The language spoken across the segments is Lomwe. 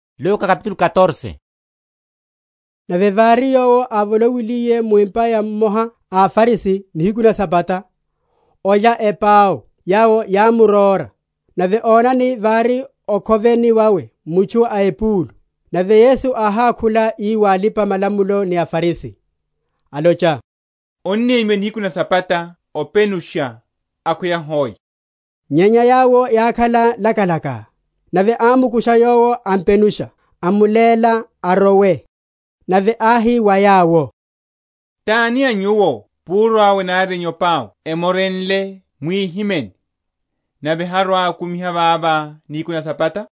Openushiwa wa mutchu awicheliwa epúlu. Nave vári Yowo ávolowiliye mu empa ya mmoha a aFarisi nihiku na Sabata, olya epau, yawo yámmurora. Nave onani, vári okhoveni wawe mutchu a epúlu. Nave Yesu áhákhula ii wa alipa‐malamulo ni aFarisi, alocha, Onnemyiwa nihiku na Sabata openusha, akhweya hoc? Nyenya yawo yákhala lakalaka. Nave ámukusha yowo ampenusha, amuléla arowe. Nave áhi wa yawo, Tani a nyuwo púru awe nari enyope awe emorenle mwihimeni, nave harwa‐akumiha vavo nihiku na Sabata?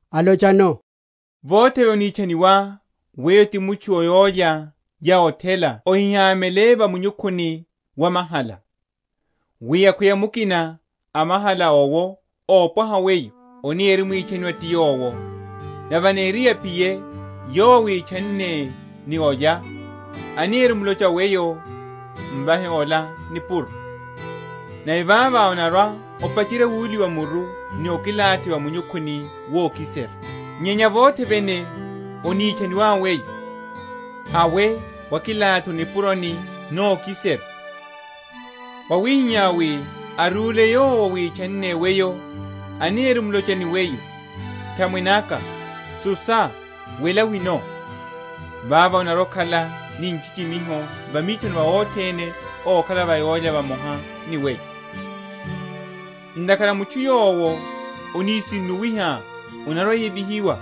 alochano, Vothe vene onitchaniwá weyo ti mutchu o yólya ya othela ohihamele va munyukhuni wa mahala; wi akhweya mukina a mahala awopwaha weyo anirimwitchaniwa ti yowo, nave aniriye aphiye yowo áwitchanne ni ola, anirimlocha wa weyo, Mvahe ola nipuro; nave vavo onarwa‐opacherya wuliwa muru vokilathi va munyukhuni wokiserya. Nyenya vothe vene onitchaniwá weyo, hawe wakilathi o nipuroni nokiserya; wawihihá wi arwile yowo áwitchanne weyo, anirimlocha ni weyo, Nthamwene aka, susa, wela wino: vavo onarwa‐okhala ni nchichimiho va mithoni va othene okhala va yólya vamoha ni weyo. Ntakhara mutchu yowo anisinnuwiha anarwa‐ayevihiwa;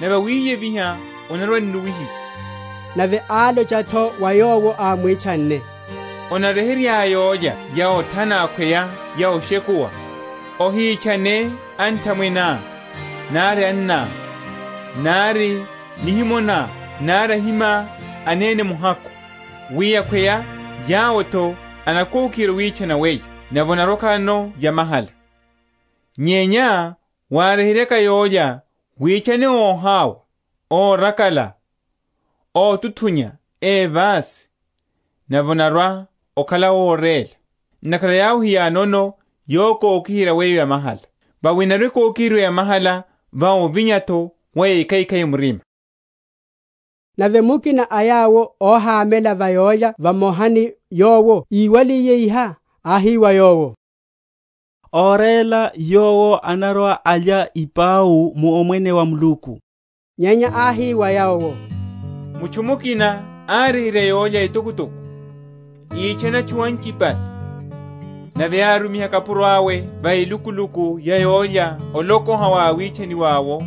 nave awiyeviha anarwa‐annuwihiwa. Nave álocha’tho wa yowo ámwitchanne, Onaryeheryá yólya ya othana akhweya ya oshekuwa, ohitchane anthamweneá, nari anná, nari a nihimo ná, nari ahimá anene muhakhu; wi akhweya yawo’tho enakokiherya owitchana weyo, nave onarwa‐okhalano yamahala. Nyenya wáryeheryaka yólya witchane óhawa, órakala, ótuthunya, évasi; nave onarwa‐okhala óréla; ntakhara yawo hiyanono yokokiherya weyo yamahala: vawi enarwa‐ekokiheryiwa yamahala va ovinya’tho wa ékhaikhai murima. Niphwanaphwaniho na yólya etokotoko. Nave mukina a yawo óhamela va yólya vamoha ni Yowo íwaliye iha, áhi wa Yowo, Óréla yowo anarwa‐alya ipau mu Omwene wa Muluku. Nyenya áhi wa yowo, Mutchu mukina áryeherya yólya etokotoko; ítchana atchu anchipale; nave árumiha kapuro awe va elukuluku ya yólya olokoha wa awitchaniwa’wo,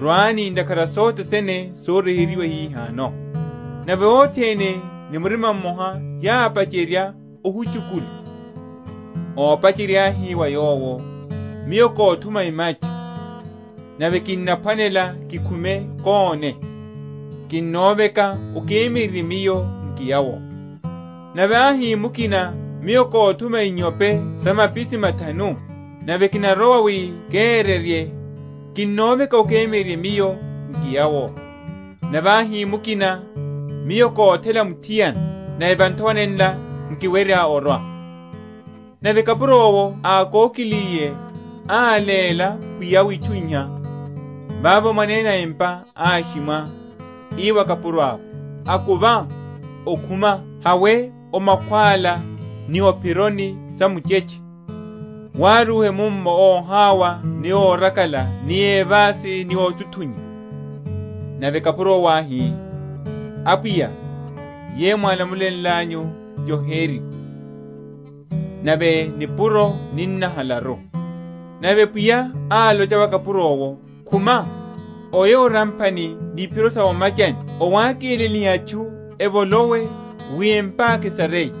Rwani, ntakhara sothe sene soryeheryiwa hihano. Nave othene ni murima mmoha yápacherya ohuchukula. Ópacherya áhi wa yowo, Miyo kothuma emacha, nave kinaphwanela kikhume kóne; kinnoveka okemyererye miyo nkiya’wo. Nave áhi mukina, Miyo kothuma inyope sa mapisi mathanu, nave kinarowa wi keryerye; kinnoveka okemyererye miyo nkiya’wo. Nave áhi mukina, Miyo kothela muthiana, nave va nthowa nenla nkiwerya orwa. Nave kapuro’wo ákokiliye áléla pwiya’we itchu iha. Vavo mwanene empa áshimwa, ii wa kapuro awe, Akuva okhuma, hawe o makhwála ni o’phironi sa muchetche, wárúhe munno óhawa ni órakala ni évasi ni ótuthunya. Nave kapuro’wo áhi, Apwiya, yeyo mwálamulenlanyu yoheriwa, nave nipuro ninnahalaru. Nave pwiya álocha wa kapuro’wo, Khuma, oye o ramphani ni iphiro sa o’machani owákelelihe atchu evolowe, wi empa’ka esareye.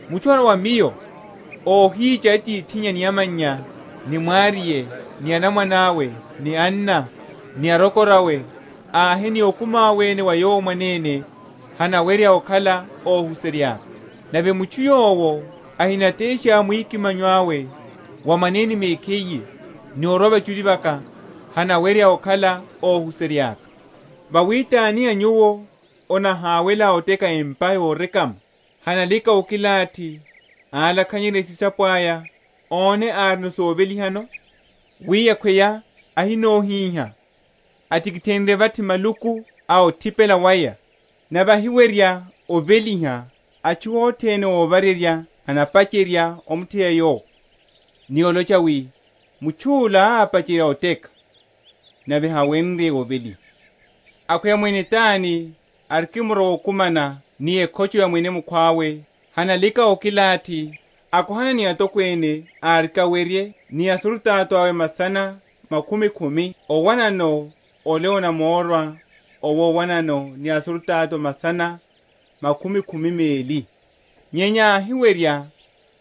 Mutchu arwa wa Miyo, óhícha atithinnya ni amannya, ni mwariye, ni anamwane, ni anna, ni arokorawe, ahe ni okumi awe ene wa yowo mwanene, hanawerya okhala óhuserya’ka. Nave mutchu yowo ahinatesha mwikimanyo awe wa mwanene mekhiye, ni orwa vachuli vaka, hanawerya okhala óhuserya’ka. Vawi tani a nyuwo anahawela oteka empa yorekama, hanalika okilathi, álakhanyerya esisapo aya, one árino sovelihano? Wi akhweya áhinohiha, atikithenrye vathi maluku a othipela waya, nave ahiwerya oveliha, atchu othene óvarerya enapacherya omutheya yowo, ni olocha wi, Mutchu’la ápacherya oteka, nave hawenrye oveliha. Akhweya mwene tani arikimrowa okumana ni ekhocho ya mwene mukhwawe, hanalika okilathi, akohana ni atokwene áriki awerye ni asurutato awe masana makhumi khumi owanano ole anamórwa owo owanano ni asurutato masana makhumi khumi meli? Nyenya áhiwerya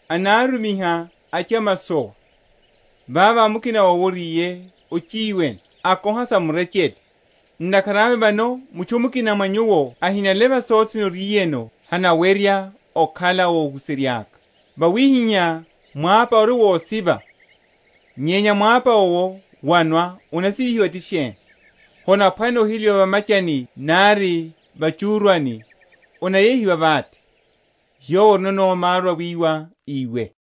anarumiha achamasowa, vavo mukina owo oriye ochiwene, akoha sa murechele. Ntakhara awe vano mutchu mukina a mwa nyuwo ahinaleva sothe sene oriyeno hanawerya okhala óhuserya’ka. Wawihihá mwapa ori wosiva; nyenya mwapa owo wonwa onasivihiwa ti sheni? Honaphwanela oheliwa va’machani nari va’chúrwani, onayehiwa vate. Yowo orino maru awíwa iwe.